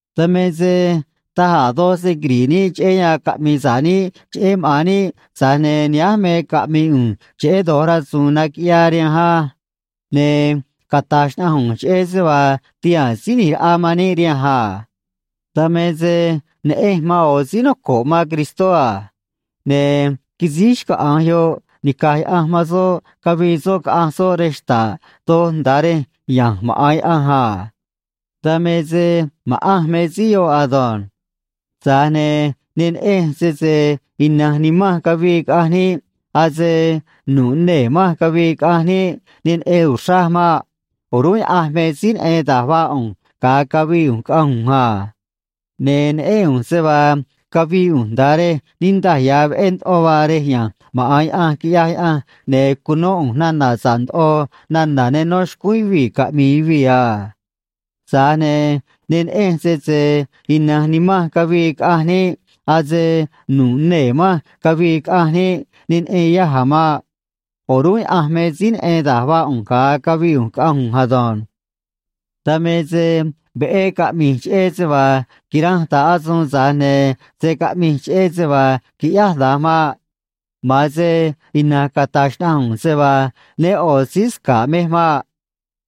Dan me se taj a̱ doj se quiri̱ꞌ níꞌ cheꞌé yan caꞌmi̱i̱ sa̱ꞌ níꞌ cheꞌé maꞌa̱n níꞌ, tza̱j ne̱ nihánj me caꞌmi̱i̱ ꞌu̱nj cheꞌé do̱j rasu̱u̱n naquiꞌyaa rihanj á. Ne̱ cata̱j xnaꞌanj ꞌu̱nj cheꞌé se vaa tihaa̱n Síí ꞌNi̱j Raꞌa man níꞌ rihanj a. Dan me se neꞌenj man ꞌo̱ síí noco̱ꞌ man Cristó a. Ne̱ quisíj xcaꞌa̱nj yoꞌ nica̱j Yaꞌanj man soꞌ, cavii soꞌ caꞌanj soꞌ rej xta̱ꞌ doj nda̱a rej ya̱nj maꞌa̱n Yaꞌanj a. Dan me se ma̱ꞌanj me síí yoꞌ ado̱nj. Tza̱j ne̱ ne neꞌenj sese ina̱nj nimanj cavii caꞌanj niꞌ, ase nu̱ꞌ nee̱ manj cavii caꞌanj niꞌ, ne neꞌen uxraj maꞌ. O̱rúnꞌ Yaꞌanj me síí neꞌen da̱j vaa ꞌu̱nj ga̱a cavii ꞌu̱nj caꞌanj ꞌu̱nj a. Ne̱ neꞌén ꞌu̱nj se vaa cavii ꞌu̱nj nda̱a rej niꞌndaj ya̱ veꞌé ndoꞌo vaa rej ya̱nj maꞌa̱n Yaꞌanj, quiꞌyaj Yaꞌanj, ne̱ cunó ꞌu̱nj nana̱ sa̱ꞌ ndoꞌo nana̱ ne nó xcúún yuvii̱ caꞌmi̱i̱ yuvii̱ a. Tza̱j ne̱ ne neꞌenj sese ina̱nj nimanj cavii caꞌanj niꞌ, ase nu̱ꞌ nee̱ manj cavii caꞌanj niꞌ, ne neꞌen yaj a̱ maꞌ. O̱rúnꞌ Yaꞌanj me síí neꞌen da̱j vaa ꞌu̱nj ga̱a cavii ꞌu̱nj caꞌanj ꞌu̱nj ado̱nj. Dan me se veꞌé caꞌmi̱j cheꞌé se vaa quiranj ta̱ꞌ asuun, tza̱j ne̱ se̱ caꞌmij cheꞌé se vaa quiꞌyáj da̱nj maꞌ. Ma̱an se ina̱nj cata̱j xnaꞌanj ꞌu̱nj se vaa né ꞌo̱ síí sca̱ꞌ mej maꞌ.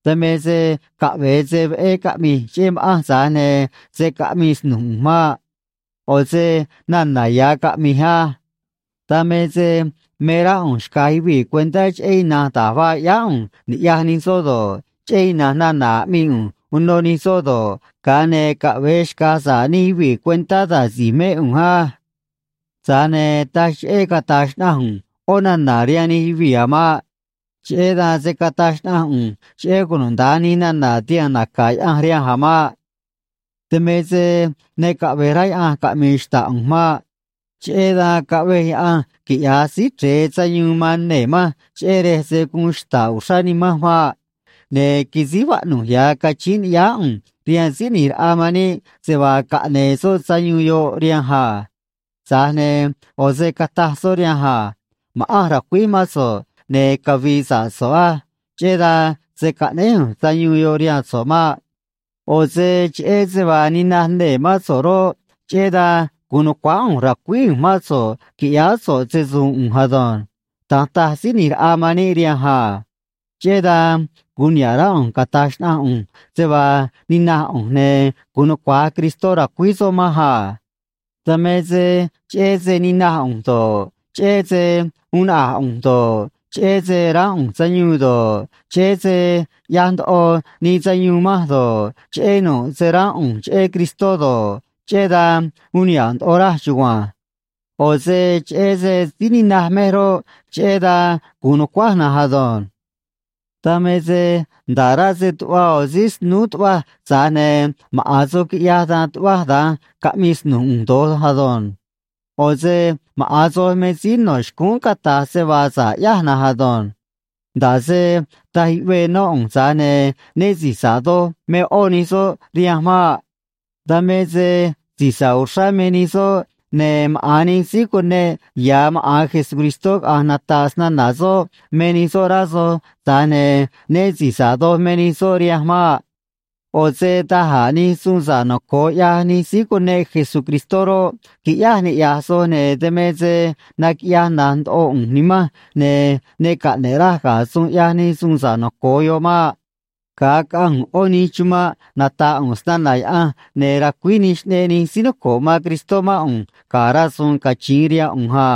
Dan me se caꞌve̱e se veꞌé caꞌmi̱j cheꞌé ma̱ꞌanj, tza̱j ne̱ se̱ caꞌmii snu̱j ꞌu̱nj maꞌ. ꞌO̱ se nana̱ ya̱ caꞌmi̱j á. Dan me se me rá ꞌu̱nj xca̱j yuvii̱ cuentá cheꞌé ina̱nj da̱j vaa ꞌyáá ꞌu̱nj niꞌya̱j nij soꞌ do̱ꞌ, cheꞌé ina̱nj nana̱ aꞌmii ꞌu̱nj uno nij soꞌ do̱ꞌ, ga̱a ne̱ caꞌve̱e xca̱j sa̱ꞌ nij yuvii̱ cuentá da̱j si̱j mé ꞌu̱nj á. Tza̱j ne̱ taj cheꞌé cata̱j xnaꞌanj ꞌu̱nj ꞌó nana̱ rihaan nij yuvii̱ a̱ maꞌ. Cheꞌé dan se̱ cataj xnaꞌanj ꞌu̱nj cheꞌé cunuda̱nj nij nana̱ tihaa̱n naca̱ Yaꞌanj rihanj a̱ maꞌ. Dan me se ne caꞌve̱j rá Yaꞌanj caꞌmi̱i̱ xta̱ꞌ ꞌu̱nj maꞌ. Cheꞌé dan caꞌvej Yaꞌanj quiꞌya̱j Síí Chre̱e sayuun man nee̱ manj, cheꞌé rej se̱ guun xta̱ꞌ uxrá nimanj maꞌ. Ne̱ quisíj vaꞌnu̱j ya̱ cachíín ni̱ꞌyáá ꞌu̱nj rihaan Síí ꞌNi̱j Raꞌa man níꞌ se vaa caꞌne̱e̱ soꞌ sayuun yoꞌ rihanj a. Tza̱j ne̱ ꞌo̱ se cataj soꞌ rihanj a: “Ma̱ꞌanj ra̱cuíj mán so̱ꞌ, ne̱ cavi̱i̱ sa̱ꞌ so̱ꞌ á. Cheꞌé dan se̱ caꞌnéj ꞌu̱nj sayuun yoꞌ rihaan so̱ꞌ maꞌ. ꞌO̱ se cheꞌé se vaa ninaj nee̱ mán so̱ꞌ roꞌ, cheꞌé dan gu̱un nu̱cuáá ꞌu̱nj ra̱cuíj ꞌu̱nj mán so̱ꞌ qui̱ꞌyáá so̱ꞌ se‑su̱u̱n ꞌu̱nj ado̱nj.” Da̱nj taj Síí ꞌNi̱j Raꞌa man níꞌ rihanj a. Cheꞌé dan gu̱un niha̱ꞌ rá ꞌu̱nj cata̱j xnaꞌanj ꞌu̱nj se vaa ninaj ꞌu̱nj, ne̱ gu̱un nucua̱j Cristó ra̱cuíj soꞌ manj a. Dan me se cheꞌé se ninaj ꞌu̱nj do̱ꞌ, cheꞌé se uun naꞌa̱j ꞌu̱nj do̱ꞌ, cheꞌé se ránꞌ ꞌu̱nj sayuun do̱ꞌ, cheꞌé se ꞌyaj ndoꞌo nii sayuun manj do̱ꞌ, cheꞌé nu̱ꞌ se ránꞌ ꞌu̱nj cheꞌé Cristó do̱ꞌ, cheꞌé dan uun niha̱ꞌ ndoꞌo raj chugua̱nj. ꞌO̱ se cheꞌé se síí ninaj mej roꞌ, cheꞌé dan gu̱un nu̱cuáj na̱nj ado̱nj. Dan me se nda̱ꞌ rá se tuꞌva ꞌo̱ síí snúú tuꞌvaj, tza̱j ne̱ maꞌa̱n soj quiꞌyaj dan tuꞌvaj da̱nj caꞌmii snu̱j ꞌu̱nj do̱j ado̱nj. ꞌO̱ se maꞌa̱n soj me síí no̱ xcúún cata̱j se vaa sa̱ꞌ ꞌyáj na̱nj ado̱nj. Nda̱ꞌ se taj yuꞌvee nó ꞌu̱nj, tza̱j ne̱ né si̱j sa̱ꞌ doj me ꞌó nij soꞌ rihanj maꞌ. Dan me se si̱j sa̱ꞌ uxrá me nij soꞌ, ne̱ maꞌa̱n nij síí cuneꞌ ya̱ maꞌa̱n Jesucristó caꞌa̱nj nata̱ꞌ snana̱ soꞌ me nij soꞌ, rá soj, tza̱j ne̱ né si̱j sa̱ꞌ doj me nij soꞌ rihanj maꞌ. ꞌO̱ se da̱j a̱ nij suun sa̱ꞌ noco̱o ꞌyaj nij síí cuneꞌ Jesucristó roꞌ, quiꞌyáj niꞌya̱j soj, ne̱ dan me se naquiꞌyaj na̱j ndoꞌo ꞌu̱nj nimanj, ne̱ ne caꞌne̱ꞌ raj ga̱ suun ꞌyaj nij suun sa̱ꞌ noco̱o yoꞌ maꞌ. Ga̱a caꞌanj ꞌu̱nj ꞌó nij chumanꞌ nata̱ꞌ ꞌu̱nj snana̱ Yaꞌanj, ne̱ racuíj nij xꞌneꞌ nij síí noco̱ꞌ man Cristó mán ꞌu̱nj ga̱ rasu̱u̱n cachiin rihaan ꞌu̱nj a.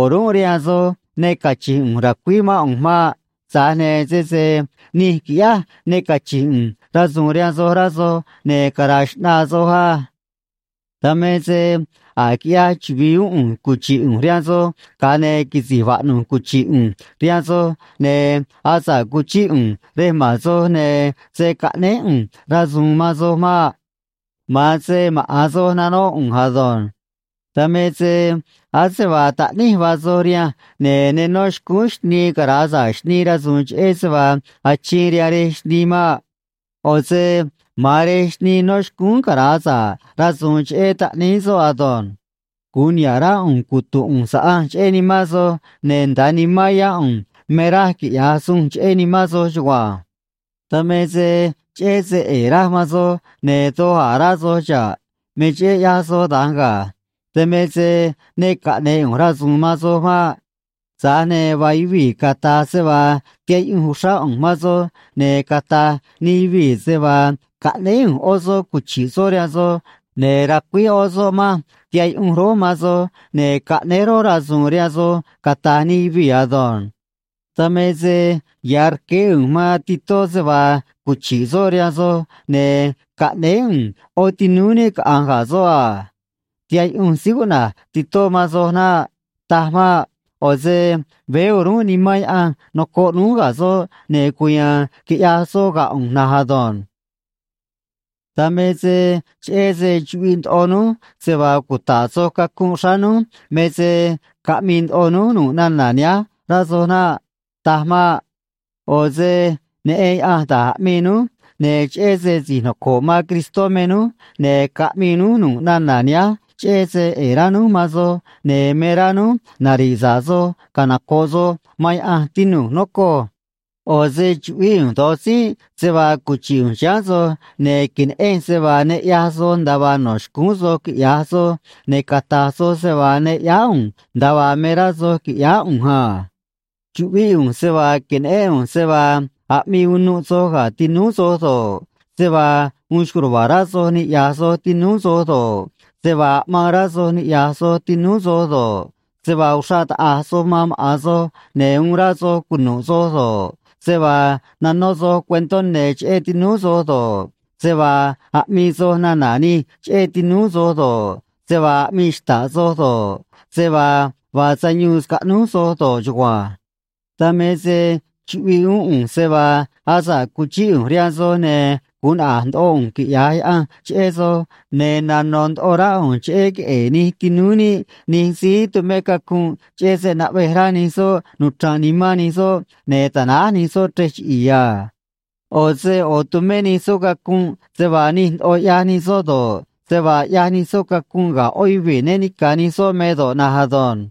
O̱rúnꞌ rihaan soj ne cachi̱nj ꞌu̱nj ra̱cuíj mán ꞌu̱nj maꞌ. Tza̱j ne̱ sese nij quiꞌyáj ne cachi̱nj ꞌu̱nj rasu̱u̱n rihaan soj, rá soj, ne̱ cara̱a̱ xꞌnaa soj á. Dan me se a̱j quiꞌyaj chuvi̱i uún ꞌu̱nj cuchi̱ꞌ ꞌu̱nj rihaan soj, ga̱a ne̱ quisi̱j vaꞌnu̱j cuchi̱ꞌ ꞌu̱nj rihaan soj, ne̱ asa̱ꞌ cuchíꞌ ꞌu̱nj rej ma̱n soj, ne̱ se̱ caꞌnéj ꞌu̱nj rasu̱u̱n man soj maꞌ. Ma̱an se maꞌa̱n soj nanóꞌ ꞌu̱nj ado̱nj. Dan me se ase vaa taꞌníj vaa soj rihanj, ne̱ ne nó xcúún xnii cara̱a sa̱ꞌ xnii rasu̱u̱n cheꞌé se vaa achiin rihaan rej xnii maꞌ. ꞌO̱ se ma̱an rej xnii no̱ xcúún cara̱a sa̱ꞌ rasu̱u̱n cheꞌé taꞌníí soꞌ ado̱nj. Gu̱un niha̱ꞌ rá ꞌu̱nj cutu̱nꞌ ꞌu̱nj saꞌanj cheꞌé nimán soj, ne̱ nda̱a nimán yá ꞌu̱nj me raj quiꞌya̱j sunj cheꞌé nimán soj chugua̱nj. Dan me se cheꞌé se ꞌe̱e̱ raj man soj, ne̱ doj a̱ rá soj xa̱ꞌ. Me cheꞌé ꞌyaj soj da̱nj ga̱. Dan me se ne caꞌne̱e̱ ꞌu̱nj rasu̱u̱n man soj maꞌ. Tza̱j ne̱ vaa yuvii̱ cata̱j se vaa tihaꞌ yuꞌunj uxrá ꞌu̱nj man soj, ne̱ cata̱j nij yuvii̱ se vaa caꞌnéé ꞌu̱nj ꞌó soꞌ cuchi̱ꞌ soꞌ rihaan soj, ne̱ racuíj ꞌó soꞌ manj tiha̱ꞌ yuꞌunj rój man soj, ne̱ caꞌnéj rój rasu̱u̱n rihaan soj, cata̱j nij yuvii̱ ado̱nj. Dan me se ya̱ rqueé ꞌu̱nj man Titó se vaa cuchi̱ꞌ soꞌ rihaan soj, ne̱ caꞌnéé ꞌu̱nj ꞌó tinúú níꞌ caꞌanj ga̱ soꞌ a. Tihaꞌ yuꞌunj síí cuꞌna̱j Titó man soj naꞌ. Taj maꞌ. ꞌO̱ se veé o̱rúnꞌ Nimán Yaꞌanj nocoꞌ núj ga̱ soꞌ, ne̱ cuya̱a̱n quiꞌyaj soꞌ ga̱ ꞌu̱nj na̱nj ado̱nj. Dan me se cheꞌé se chuꞌviꞌ ndoꞌo núj se vaa cuta̱ꞌ soj cacunꞌ xráá núj me se caꞌmii ndoꞌo núj nu̱ꞌ nana̱ nihánj, rá soj naꞌ. Taj maꞌ. ꞌO̱ se neꞌen Yaꞌanj da̱j aꞌmii núj, ne̱ cheꞌé se si̱j noco̱ꞌ man Cristó me núj, ne̱ caꞌmii núj nu̱ꞌ nana̱ nihánj cheꞌé se ꞌe̱e̱ rá núj man soj, ne̱ me rá núj nari̱ꞌ sa̱ꞌ soj canoco̱ꞌ soj man Yaꞌanj, tinu̱j, nocoj. ꞌO̱ se chuꞌvíꞌ ꞌu̱nj do̱j tzínꞌ se vaa cuchi̱ꞌ ꞌu̱nj chiháán soj ne̱ que̱neꞌenj se vaa ne ꞌyaj soj nda̱a vaa no̱ xcúún soj quiꞌya̱j soj, ne̱ cata̱j soj se vaa ne ꞌyáá ꞌu̱nj nda̱a vaa me rá soj qui̱ꞌyáá ꞌu̱nj a. Chuꞌvíꞌ ꞌu̱nj se vaa que̱neꞌén ꞌu̱nj se vaa aꞌmii unuꞌ soj ga̱ tinúú soj do̱ꞌ, se vaa uun xco̱j ruva̱a̱ rá soj niꞌya̱j soj tinúú soj do̱ꞌ, se vaa aꞌmaan rá soj niꞌya̱j soj tinúú soj do̱ꞌ, se vaa uxraꞌ taꞌa̱j soj man maꞌa̱n soj ne̱ uun rá soj cunu̱ꞌ soj do̱ꞌ, se vaa nanó soj cuentó ne̱ cheꞌé tinúú soj do̱ꞌ, se vaa aꞌmii soj nana̱ nij cheꞌé tinúú soj do̱ꞌ, se vaa aꞌmii xta̱ꞌ soj do̱ꞌ, se vaa vaa sayuun scaꞌnúj soj do̱ꞌ chugua̱nj. Dan me se chuꞌviꞌ uún ꞌu̱nj se vaa asa̱ꞌ cuchíꞌ ꞌu̱nj rihaan soj, ne̱ gu̱un naꞌa̱j ndoꞌo ꞌu̱nj quiꞌya̱j Yaꞌanj cheꞌé soj, ne̱ nano̱ ndoꞌo rá ꞌu̱nj cheꞌé queꞌe̱e̱ nij tinúú níꞌ nij síí tumé cacunꞌ, cheꞌé se naꞌvej rá nij soꞌ nuchra̱nꞌ nimán nij soꞌ ne̱ ta̱náj nij soꞌ chrej chiꞌi̱i̱ a. ꞌO̱ se ꞌo̱ tu̱mé nij soꞌ cacunꞌ se vaa nij ndoꞌo ꞌyaj nij soꞌ do̱ꞌ, se vaa ꞌyaj nij soꞌ cacunꞌ ga̱ ꞌó yuvii̱ né ni̱ca̱ nij soꞌ me do̱ꞌ na̱nj ado̱nj.